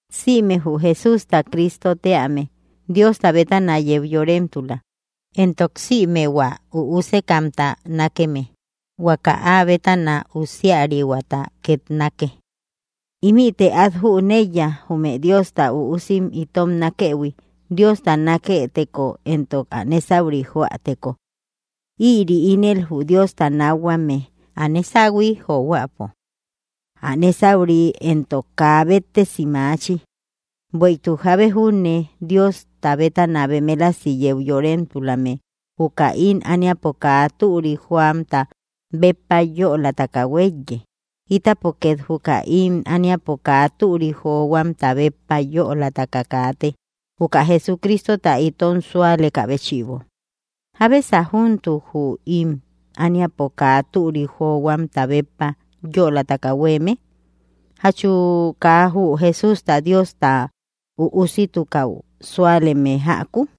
Sïme jü Jesústa Cristo tíame, Diosta bétana yeu yoremtula. Éntok sïme hua üusekamta nákeme, huaka ä bétana úsiarihuata két nákke. Ímïte at jüneiya jume Diosta üusim itom nákëhui, Diosta naketeko éntok ä nésauri joäteko. Ïri ínel jü Diosta nákhuame, ä nésahui johuäpo. Ä nésauri éntok, kaa béttesi maachi, bueïtuk jábe júne Diosta bétana bemelasi yeu yoremtulame juka ím ániapo kaa türik johuamta béppa yölataka huéiye. Ítapo két juka ím ániapo kaa türik johuamta béppa yölataka kaate, juka Jesucristota itom súalekä béchïbo. ¿Jábesa júntuk jü ím ániapo kaa türik johuamta béppa yölataka huéeme? ¿Jachu kaa jü Jesústa Diosta Üusitukäu súaleme jäku?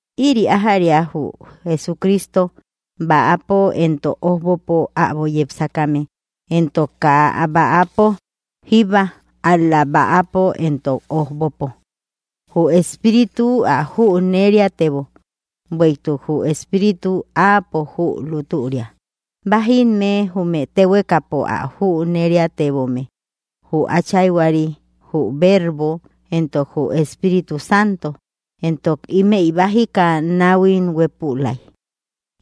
Ïri ájäria jü Jesucristo, bäapo entok ójbopo äbo yepsakame, entok kaa bäapo jíbba, ál‑la bäapo entok ójbopo. Jü Espíritu ä jüneriatebo; bueïtuk jü Espíritu áapo jü lútüria. Bájimme jume téhuekapo ä jüneriatebome: Jü Áchayhuari, jü Vervo, éntok jü Espíritu Santo. Entok ímëi bájika náhuim huépülai.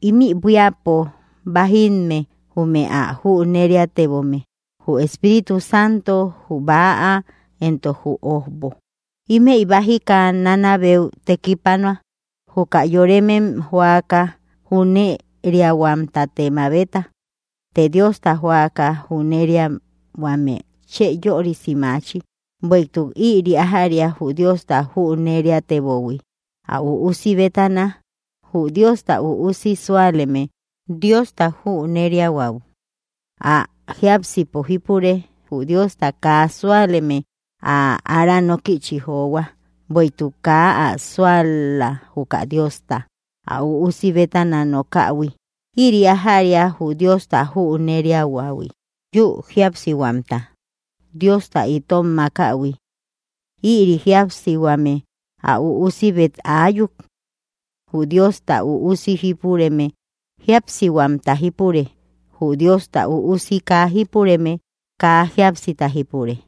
Ímï buíapo bájimme jume áa jüneriatebome: Jü Espíritu Santo, jü bäa, éntok jü ójbo. Ímëi bájika nanabeu tekipanua. Juka yoremem joaka jüneriahuamtate mabeta, të Diosta joaka jüneriahuame chë yörisi maachi. Bueïtuk ïri ájäria jü Diosta jüneriateböhui ä üusi bétana. Jü Diosta Üusi súaleme, Diosta jüneriahuäu áa jiápsipo jípure; jü Diosta kaa suáleme, ä ára nókïchi johua, bueïtuk kaa ä sual-la juka Diosta, ä Üusi bétana nokähui. Ïri ájäria jü Diosta júneriahuähui: yü jíapsihuamta Diosta, itom makähui. Ïri jíapsihuame, ä Üusibet áyuk. Jü Diosta Üusi jípureme, jíapsihuamta jípure; jü Diosta Üusi kaa jípureme, kaa jíapsita jípure.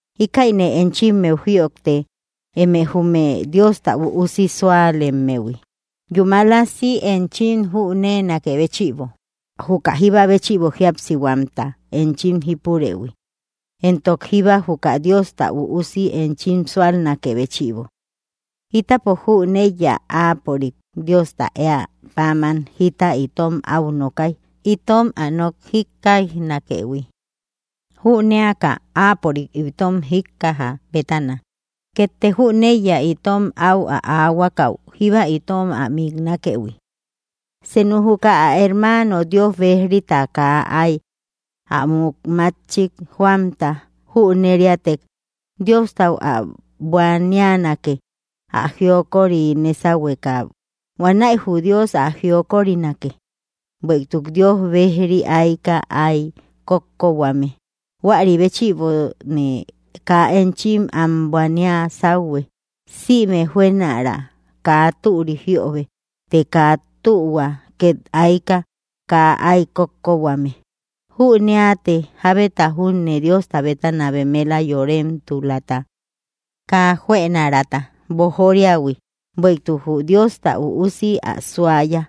Íkäine enchimmeu jïojte, eme jume Diosta Üusi súalemmehui, yúmalasi enchim jüneenakë béchïbo juka jíba béchïbo jíapsihuamta enchim jípurëhui, éntok jíba juka Diosta Üusi enchim súalnakë béchïbo. Ítapo jüneiya áapörik, Diosta, éä páman jita itom au nokay, itom ä nok jíkkaijnakëhui. Jüneaka áapörik itom jíkkajä bétana, kétte jüneiya itom áu aahuakau jíba itom ä miknakëhui. Senu juka ä hermaano Dios bejrita kaa ay ä muk mátchik joamta jüneriätek, Diostau ä buanianake ä jiokori nésauhueka. Huanäi jü Dios ä jiokorinake. Bueïtuk Dios bejri aika ay kókkohuame, huäri béchïbone kaa enchim am buania sáuhue. Sïme juënara kaa türi jiöbe, të kaa tühua két aika kaa ay kókkohuame. Jüneate jábeta júne Diosta bétana bemela yoremtulata kaa juënaraata boojoriähui, bueïtuk jü Diosta Üusi ä suaya.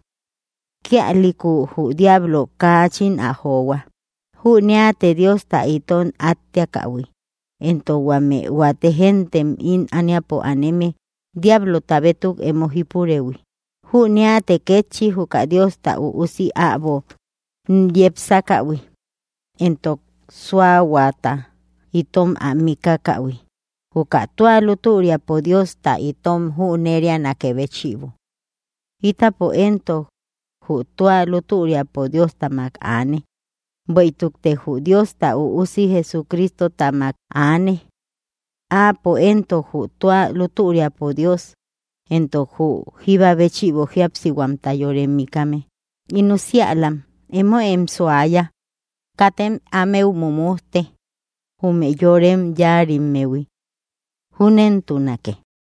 Kíalïku jü diablo kaachin ä johua. Jüneate Diosta itom átteakähui, éntok huame huate géntem ím ániapo aneme diablota bétuk emo jípurëhui. Jüneate kétchi juka Diosta Üusi äbo yepsakähui, éntok súahuata itom ä mikakähui juka tua lútüriapo Diosta itom jünerianakë béchïbo. Ítapo éntok, jü tua lútüriapo Dióstamak aane, bueïtukte jü Diosta Üusi Jesucristotamak aane. Áapo éntok, jü tua lútüriapo Dios, éntok jü jíba béchïbo jíapsihuamta yore mikame. In usiälam, emoem suaya; katem ámeu mujmujte, jume yorem yáarimmehui. Júnentunake.